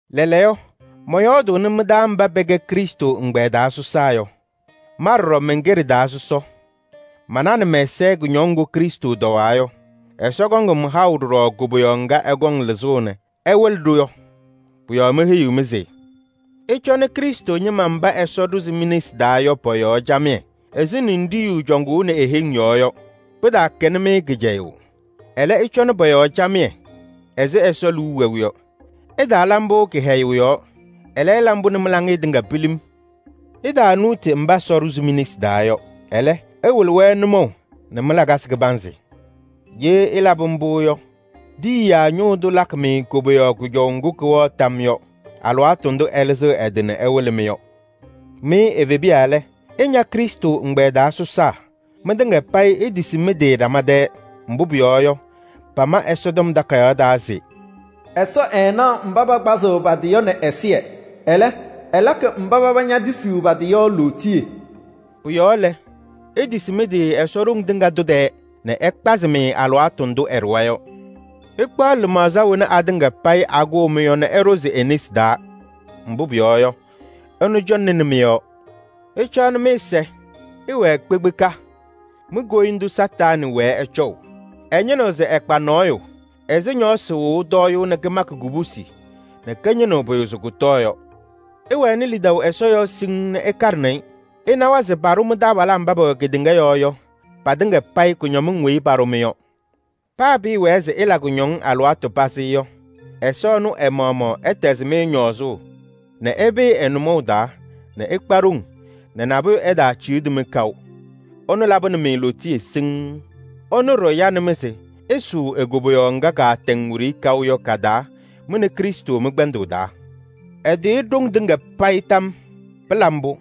Lɛɛlɛɛyɔ, mɔyɔɔdʋʋnɩ mɩ-taa mba pɛkɛ Krɩstʋ ɛgbɛyɛ taa sɔsaa yɔ. Ma ɖɔɖɔ mɛnkɛ ɖɩ-taa sɔsɔ. Mananɩ mɛ-ɛza kʋñɔŋ ŋgʋ Krɩstʋ tɔwaa yɔ. Ɛsɔ kɔŋ-m haʋ ɖɔɖɔ koboyaɣ ŋga ɛkɔŋ lɩzʋʋ nɛ ɛwɩlɩ-ɖʋ yɔ. Pʋ-yɔɔ meheyiɣ-mɩ se: ɩcɔnɩ Krɩstʋ ñɩma mba Ɛsɔ ɖʋzɩ mi-nesi taa yɔ pɔ-yɔɔ camɩyɛ ɛzɩ ninɖiɣyu cɔŋʋʋnɩ e-heŋ yɔɔ yɔ. Pɩtaakɛnɩ-mɩ kɩcɛyʋʋ. Ɛlɛ, ɩcɔnɩ pɔ-yɔɔ camɩyɛ ɛzɩ Ɛsɔ liu wɛʋ yɔ. Ɩtaala mbʋ kɩhɛyʋʋ yɔɔ, ɛlɛ, ɩla mbʋ nɛ mɩ-laŋɩyɛ tɩŋa pilim. Ɩtaanuuti mba Ɛsɔ ɖʋzɩ mi-nesi taa yɔ. Ɛlɛ, ɩwɩlɩ-wɛ nʋmɔʋ nɛ mɩ-lakasɩ kɩbanzɩ. Ye ɩlabɩ mbʋ yɔ, Ɖiyiyaa Ñʋʋ Tʋ lakɩ-mɩ koboyaɣ kʋjɔʋ ŋgʋ kɩwɛɣ tam yɔɔ yɔ, alɩwaatʋ ndʋ ɛlɩzɩɣ ɛ-tɩ nɛ ɛwɩlɩ-mɩ yɔ. Mɩ evebiya lɛ, ɩña Krɩstʋ ɛgbɛyɛ taa sɔsaa. Mɩtɩŋa payɩ itisi mɩ-tɩ ɖama tɛɛ. Mbʋ pʋyɔɔ yɔ, pama Ɛsɔtɔm Takayaɣ taa se: “Ɛsɔ ɛɛnaɣ mba pakpazɩɣ pa-tɩ yɔ nɛ ɛzɩyɛ. Ɛlɛ, ɛlakɩ mba paba ñetisiɣ pa-tɩ yɔ lootiye.” Pʋ-yɔɔ lɛ, itisi mɩ-tɩ Ɛsɔ ɖoŋ tɩŋa tʋ tɛɛ nɛ ɛkpazɩ-mɩ alɩwaatʋ ndʋ ɛɖʋwa yɔ. Ɩkpaɣ lɩmaɣza wena atɩŋa payɩ akʋʋ-mɩ yɔ nɛ ɩɖʋzɩ e-nesi taa, mbʋ pʋyɔɔ yɔ, ɛnʋ cɔŋnɩnɩ mɩ-yɔɔ. Ɩcaɣnɩ mɩ-ɛza! Ɩwɛɛ kpekpeka! Mi-koyindu Satanɩ wɛɛ ɛcɔʋ. Ɛñɩnɩɣ se ɛkpa nɔɔyʋ ɛzɩ ñɔɔsɩ wɩɣʋ tɔyʋʋ nɛ kɩmakɩ kubusi nɛ kɩñɩnɩɣ pʋyʋ se kʋtɔɔ yɔ. Ɩwɛnɩ lidaʋ Ɛsɔ yɔɔ siŋŋ nɛ ɩkaɖɩnɩ-ɩ. Ɩnawa se paɖʋ mɩ-taabalaa mba pɛwɛ kedeŋa yɔɔ yɔ patɩŋa payɩ kʋñɔmɩŋ weyi paɖʋ-mɩ yɔ. Paa pɩɩwɛɛ se ɩla kʋñɔŋ alɩwaatʋ pazɩ yɔ, Ɛsɔ ɛnʋ ɛ-maɣmaɣ ɛtɛzɩ-mɩ ñɔɔzʋʋ nɛ ɩpɩɩ ɛ-nʋmɔʋ taa nɛ ɩkpa ɖoŋ nɛ nabʋyʋ ɛtaaciɣdi-mɩ kaʋ. Ɛnʋ labɩnɩ-mɩ lootiye siŋŋ. Ɛnʋ ɖɔɖɔ yanɩ-mɩ se ɩsʋʋ e-koboyaɣ ŋga kaatɛŋ wiɖiyi kaʋ yɔ ka-taa mɩ nɛ Krɩstʋ mɩ-kpɛndʋʋ taa. Ɛtɩɣyɩ ɖoŋ tɩŋa payɩ tam yɔɔ! Pɩla mbʋ!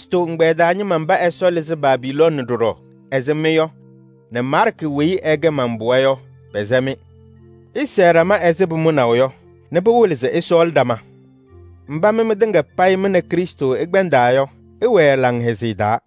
Krɩstʋ ɛgbɛyɛ taa ñɩma mba Ɛsɔ lɩzɩ Babilooni ɖɔɖɔ ɛzɩ mɩ yɔ nɛ Maarkɩ weyi ɛkɛ man-pɩɣa yɔ, pɛsɛ-mɩ. Ɩsɛɛ ɖama ɛzɩ pʋmʋnaʋ yɔ nɛ pɩwɩlɩ se ɩsɔɔlɩ ɖama. Mba mɩ mɩtɩŋa payɩ mɩ nɛ Krɩstʋ ɩkpɛndaa yɔ, ɩwɛɛ laŋhɛzɩyɛ taa.